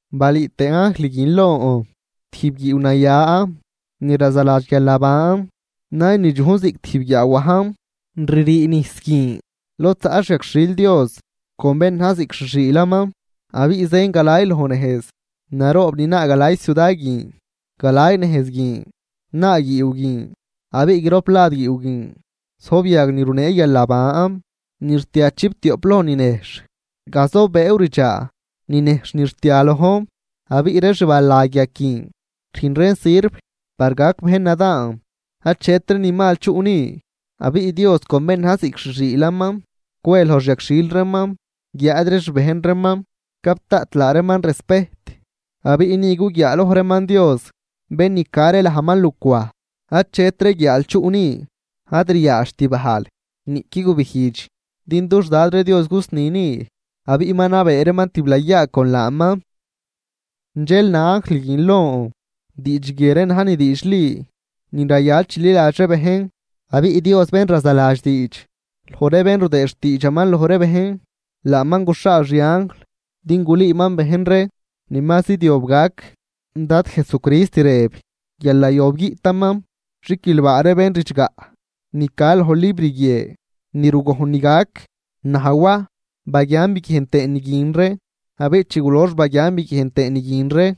Balüü tëë anjl guin lon tijb guiiw naya ni razaladx guialnaban, naynidxuj ziꞌc tijb guiaawajn. Ririi nijs guin lod zaꞌ xyagxhil Dios con bén na̱j ziꞌc xi xiilaman, abiꞌ zën galay loj nejz naroob ni naa galay ciuda guin. Galay nejz guin naa guiiw guin, abiꞌ grop lad guiiw guin zojb yag ni runee guialnaban ni rtia chiptioꞌp loj ninejxh, gazobëëw ridxaa ninejxh ni rtia lojn. Abiꞌ ree xbalag yag guin rüjn reen sirv par gac bejn nadaan. Achetri ni mal chuꞌ ni, abiꞌ Dios con bén na̱j ziꞌc xi xiilaman cwe loj xi yagxhil reeman guiáad ree xbejn reeman gap daꞌt laa reeman respejt. Abiꞌ ni guguiaaloj reeman Dios, bén ni ca ree lajman lucwaj. Achetri guiaal chuꞌ ni, ad ryaadxt bajl niꞌqui gubijdx din dux Dad ree Dios gusni ni, abiꞌ ma nabee reeman tiblayaa con laaman. Dxel na anjl guin lon: ―Diidx guie ree na̱j ni diidxli ni rayal chililadx ree bejn. Abiꞌ Dios bén razaladx diidx loj ree bén rudëëd xtiidxaman loj ree bejn, laaman guxhaal xi anjl din gulüüman bejn ree ni ma zidyob gac. Dad Jesucrist rëb guial nayob guiꞌtaman. ¡Xiquilbaa ree bén ridxgaꞌ ni ca loj libr guie ni rugojn ni gac! Naj Waj, baguian biguiejn tëën ni guin ree. Abiꞌ chi gulox baguian biguiejn tëën ni guin ree,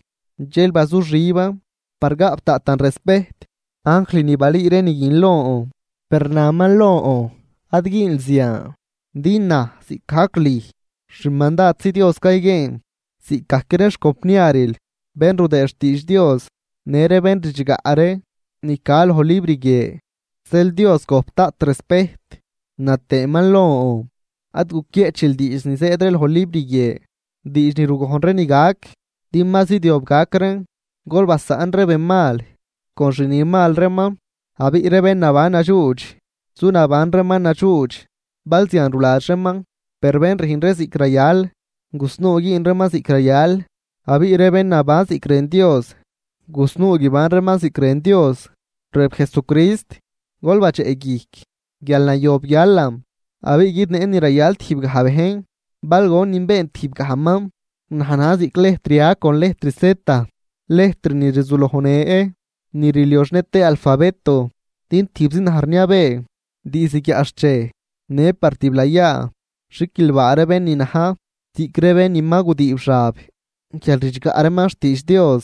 dxel bazuxiban par gaꞌp daꞌtan respejt anjl ni balüü ree ni guin lon. Per naman lon: ―Ad güünl zian. Din naj ziꞌcgajc lüj, xmandadzi Dios cayguieen, ziꞌcgajc ree xcompniaril bén rudëëd ree xtiidx Dios, në ree bén ridxgaꞌ ree ni ca loj libr guie. Zeel Dios gojp daꞌt respejt. Na tëëman lon: ―Ad guquieꞌchil diidx ni zëëd ree loj libr guie, diidx ni rugojn ree ni gac, din ma zidyob gac reen. Gol basaꞌn ree ben mal con xni mal reeman, abiꞌ ree bén naban nadxuudx zu naban reeman nadxuudx bal zian ruladx reeman. Per bén rüjn ree ziꞌc rayal gusnuu güün reeman ziꞌc rayal abiꞌ ree bén naban ziꞌc rën Dios gusnuu guiban reeman ziꞌc rën Dios. Rëb Jesucrist: ―Gol badxeꞌguijc guial nayob guialan, abiꞌ guidneꞌn ni rayal tijbgaj bejn bal gonin been tijbgajman. Naj na̱j ziꞌc lejtr A con lejtr Z, lejtr ni rzulojnë ni rlioxnë tëë alfabeto, din tijbzi naj rniabee diizd guiaꞌxchej në par tiblayaa. Xiquilbaa ree bén ni na̱j ziꞌc ree bén ma gudiib xab guial ridxgaꞌ reeman xtiidx Dios,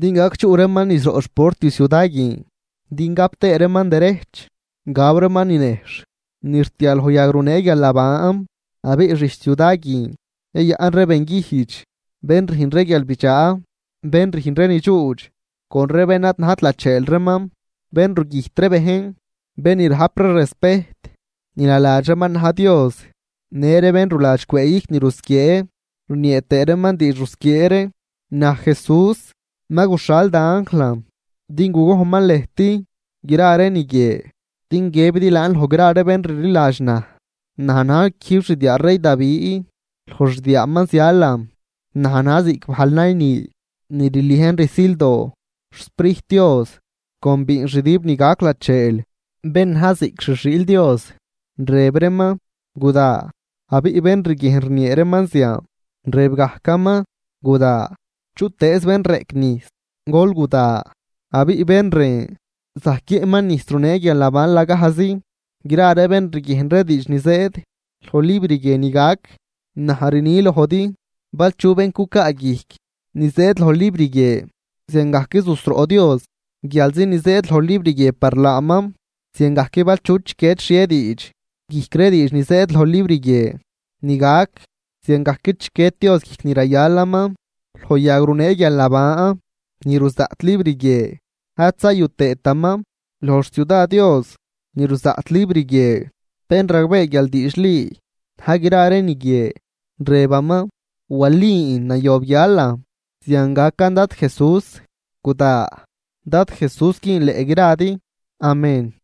din gac chuꞌ reeman niz roꞌ xport ciuda guin din gap tëë reeman derejch gaw reeman ni nejxh ni rtia loj yag runee guialnaban. Abiꞌ xijch ciuda guin yayaꞌn ree benguijdx, bén rüjn ree guialbidxaa, bén rüjn ree ni dxuudx con ree bén ad najt lacheel reeman, bén rugüjt ree bejn, bén ni rajp ree respejt ni naladx reeman na̱j dios, në ree bén ruladx cwëëguijc ni rusquiee rniee tëë reeman diidx rusquiee ree. ―Naj Jesús ma guxhal da anjlan din gugojnman lëjt gra ree ni guie din guiëbidi laan loj gra ree bén rliladx naj. Naj na̱j quijb xdiaa rey Davi, loj xdiaaman zialan. Naj na̱j ziꞌc bajl nayni ni rliejn rsildoo. XSprijt Dios con biinxdüb ni gac lacheel bén na̱j ziꞌc xi xiil Dios rëb reeman: ―Guda. Abiꞌ bén riguiejn rniee reeman zian, rëb gajcaman: ―Guda. Chutëëz bén reꞌc nijs, gol guda, abiꞌ bén rën zajc guiëꞌman nijs runee guialnaban lagajzi. Gra ree bén riguiejn ree diidx ni zëëd loj libr guie ni gac, naj rni lojdi bal chu bén gucaa guijc ni zëëd loj libr guie, ziangajc zusroꞌ Dios guialzi ni zëëd loj libr guie par laaman. Ziangajc bal chu chiquied xhie diidx guijc ree diidx ni zëëd loj libr guie ni gac ziangajc chiquied Dios guijc ni rayalaman loj yag runee guialnaban ni ruzaꞌt libr guie ad zayu tëëtaman loj xciuda Dios ni ruzaꞌt libr guie. Bén ragbee guial diidxli na̱j gra ree ni guie, rëbaman: ―Walin, nayob guialan. Zian gacan Dad Jesús, ¡Guda! Dad Jesús güünleꞌ gradi. Amén.